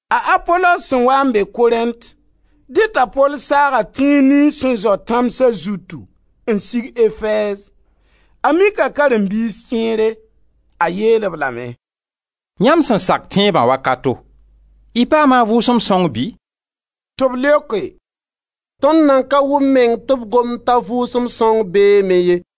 A Apolos sẽn waa n be Korẽnt, dẽ t'a Pol saaga tẽns niyns sẽn zao tãmsa zutu n sig Efɛɛz. A mika karen-biis kẽere. A yeel-b lame: «Yãmb sẽn sak tẽebã wakato, y paama a Vʋʋsem Sõng bɩ?» Tɩ b leoke: «Tõnd nan ka wʋm meng tɩ b gomd t'a Vʋʋsem Sõng beeme ye.»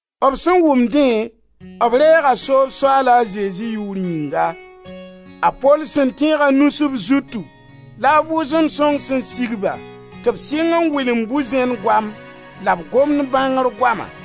B sẽn wʋm dẽ b reega soob Soaal a Zezi yʋʋr yĩnga. A Pol sẽn tẽeg a nus b zutu la a Vʋʋsem Sõng sẽn sig-ba tɩ b sɩng n wɩlemd bu-zẽn goam la b gomd bãngr goama.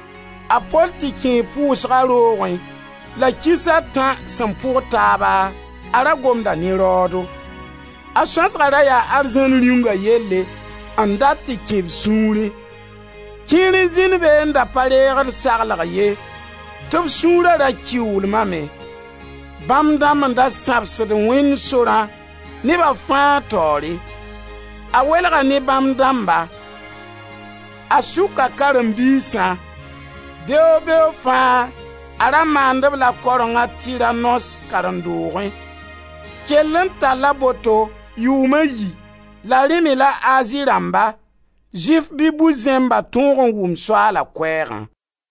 A Pol tɩ kẽe pʋʋsga roogẽ la kiis a tã sẽn pʋg taaba a ra gomda ne raoodo. A Sõasga ra yaa Arzãn Rĩunga yelle n dat tɩ kẽ b sũurẽ. Kẽer n zĩnd be n da pa reegd saglg ye tɩ b sũura ra kɩʋʋlmame. Bãmb dãmb n da sãbsd Wẽnd sorã, neba fãa taoore. A welga ne bãmb dãmba. A sʋka karen-biisã. Beoog-beoog fãa a ra maand-b la kareng a Tiranos karen-doogẽ. Kell n talla boto yʋʋm a yi la rẽ me la Azi rãmba, Zʋɩf bɩ bu-zẽmba tõog n wʋm Soaala Koɛɛgã.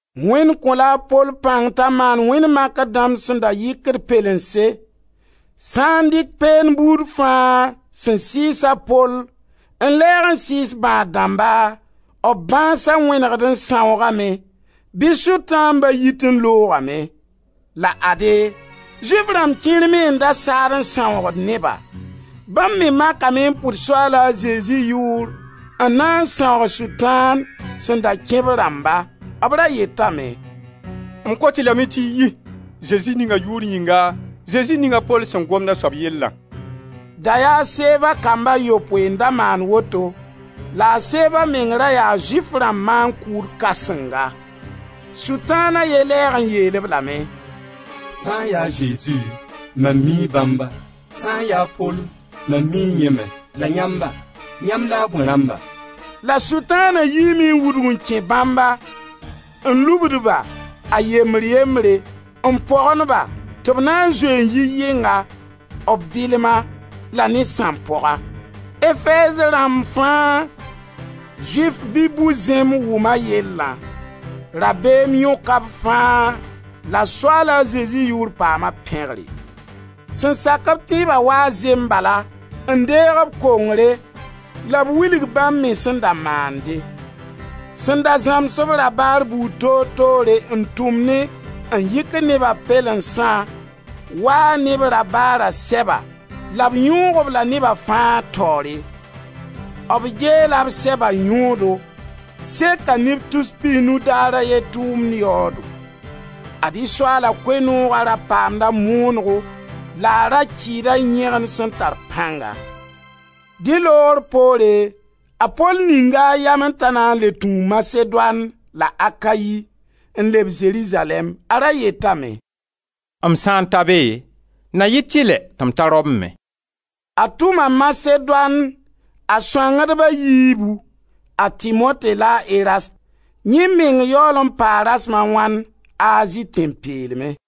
Wẽnd kõ-la a Pol pãng t'a maand wẽnd makr dãmb sẽn da yɩkd pɛlense. Sã n dɩk peend buud fãa sẽn sɩɩs a Pol n lɛɛg n sɩɩs bãad-dãmba, b bãasa wẽnegd n sãoogame, bɩ Sʋtãamba yit n loogame. La ade, Zʋɩf rãmb kẽer me n da saad n sãoogd neba. Bãmb me makame n pʋd Soaala Zezi yʋʋr n na n sãoog Sʋtãan sẽn da kẽ b rãmba. B ra yetame: «M kot-y lame tɩ y yi, Zezi ninga yʋʋr yĩnga, Zezi ning a Pol sẽn gomd a soab yellã!» Da yaa a Seva kamb a yopoe n da maand woto la a Seva meng ra yaa Zʋɩf rãmb maan-kʋʋd kãsenga. Sʋtãan a ye lɛɛg n yeel-b lame: «Sã n ya a Zezi, mam mii bãmba, Sã n ya a Pol, mam mii yẽ me. La yãmba, yãmb la a bõe rãmba?» La Sʋtãana yiime n wudg n kẽ bãmba, n lubd-ba, a yembr-yembre, n pogend-ba tɩ b na n zoe n yi yɩnga, b bɩlma, la ne sãmpoaga. Efɛɛz rãmb fãa, Zʋɩf bɩ bu-zẽmb wʋma yellã. Rabeem yõka b fãa, la Soaala Zezi yʋʋr paama pẽgre. Sẽn sak-b tẽeba waa zembala n deeg b kongre la b wilg bãmb me sẽn da maande. Sẽn da zãms-b rabaar buud toor toore n tʋmnẽ n yɩkd neba pɛlensã, waa ne b rabaara sɛba la b yõog-b la neba fãa taoore. B geela b sɛba yõodo. Seka neb tus pis nu daar a ye tʋʋmd yaoodo. Ad-y Soaala Koe-nooga ra paamda moonego la a ra kɩɩda yẽgen sẽn tar pãnga. Dẽ loogr poore a Pol ninga a yamẽ t'a na n le tũu Masedoan la Akayi n leb Zerizalɛɛm. A ra yetame: «M sã n ta be na yɩ tɩlɛ tɩ m ta Rom me.» A tʋma Masedoan a sõangdba a yiibu, a Timote la a Erast; yẽ meng yaool n paa rasem a wãn Azi tẽn-peelmẽ.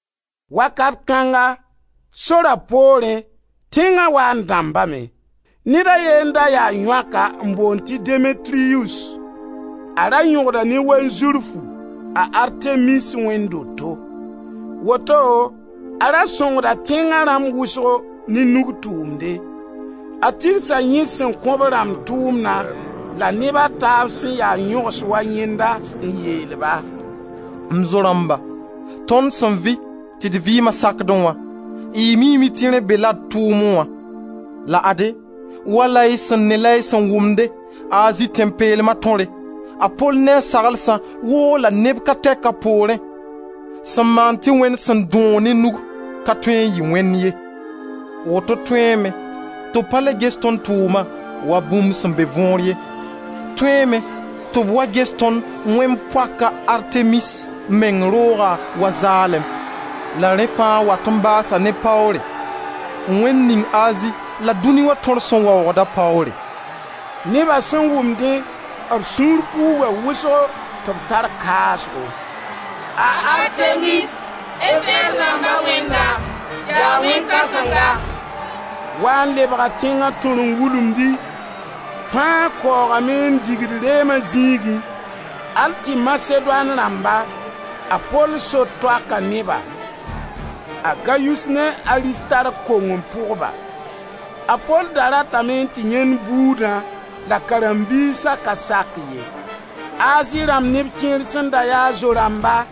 Wakat kãnga, Sora poorẽ, tẽnga wa n dãmbame. Ned a ye n da ya yõaka n boond tɩ Demetriyus. A ra yõgda ne wanzurfu a Artemis wẽnd doto. Woto a ra sõngda tẽnga rãmb wʋsgo ne nug tʋʋmde. A tigsa yẽ sẽn kõ b rãmb tʋʋmna la neba a taab sẽn ya yõgs wa yẽnda n yeel-ba: «M zo-rãmba, tõnd sẽn vɩ tɩ d vɩɩma sakdẽ wã, y miime tɩ rẽ bela d tʋʋmnẽ wã. La ade, wala y sẽn ne la y sẽn wʋmde Azi tẽn-peelma tõre, a Pol ne a saglsã woola neb ka tɛk a poorẽ sẽn maand tɩ wẽnd sẽn dõog ne nug, ka tõe n yɩ wẽnd ye. Woto tõeeme tɩ b pa le ges tõnd tʋʋmna wa bũmb sẽn be võor ye, tõeeme tɩ b wa ges tõnd wẽnd poaka Artemis meng rooga wa zaalem, la rẽ fãa wat n baasa ne paoore, wẽnd ning Azi la dũni wã tõr sẽn waoogda paoore.» Neba sẽn wʋm dẽ, b sũur puuga wʋsgo tɩ b tar kaasgo: «A Artemis, Efɛɛz rãmba wẽnda, yaa wẽn kãsenga!» Waa n lebga tẽnga tõr n wulumdi. Fãa kaoogame n digd reema zĩigẽ al tɩ Masedoan rãmba, a Pol so-toaka neba, a Gayus ne a Aristark, kong n pʋg-ba. A Pol da ratame n tɩ yãend buudã la karen-biisa ka sak ye. Azi rãmb neb kẽer sẽn da ya a zo-rãmba,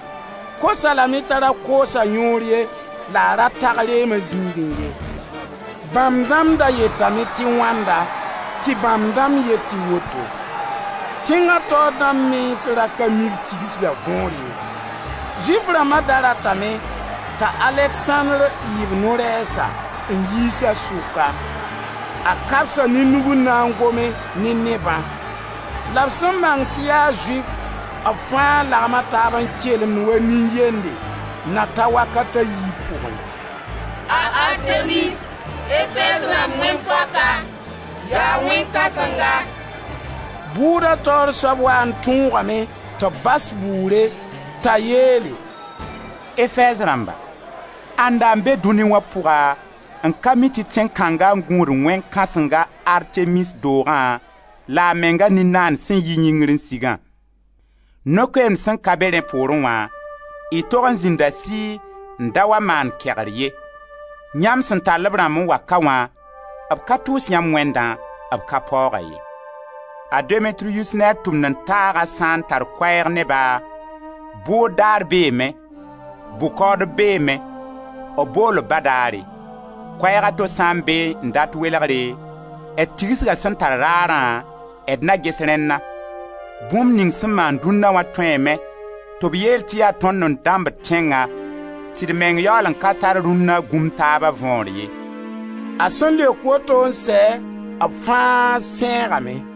kos-a lame t'a ra koos a yõor ye, la a ra tag reema zĩigẽ ye. Bãmb dãmb da yetame tɩ wãnda, tɩ bãmb dãmb yet tɩ woto. Tẽnga taoor dãmb mens ra ka mi b tigsga võor ye. Zʋɩf rãmba da ratame t'a Aleksãndr yɩ b norɛɛsa, n yiisa sʋka. A kabsa ne nug n na n gome ne nebã. La b sẽn bãng tɩ yaa Zʋɩf, b fãa lagma taab n kelemd wa nin-yende, na ta wakat a yiib pʋgẽ: «A Artemis, Efɛɛz rãmb wẽn poaka, yaa wẽn kãsenga!» Bʋʋda taoor soab waa n tõogame tɩ b bas bʋʋre t'a yeele: «Efɛɛz rãmba, ãnda be dũni wã pʋga n ka mi tɩ tẽn kãnga n gũud wẽn kãsenga Artemis doogã la a menga nin-naand sẽn yi yĩngr n sigã? No-koeemd sẽn ka be rẽ poorẽ wã, y tog n zĩnda sɩɩ n da wa maan kegr ye. Yãmb sẽn tall-b rãmb n wa ka wã, b ka tʋʋs yãmb wẽndã, b ka paooga ye. A Demetriyus ne a tʋmd-n-taaga sã n tar koɛɛg ne ba, bʋʋd daar beeme, bʋ-kaoodb beeme, b bool-b badaare. Koɛɛg a to sã n beẽ n dat welgre, d tigsga sẽn tar raarã, d na ges rẽnna. Bũmb ning sẽn maan dũnna wã tõeeme tɩ b yeel tɩ yaa tõnd n dãmbd tẽngã, tɩ d meng yaool n ka tar rũnna gũm taaba võor ye.» A sẽn leok woto n sɛ, b fãa sẽegame.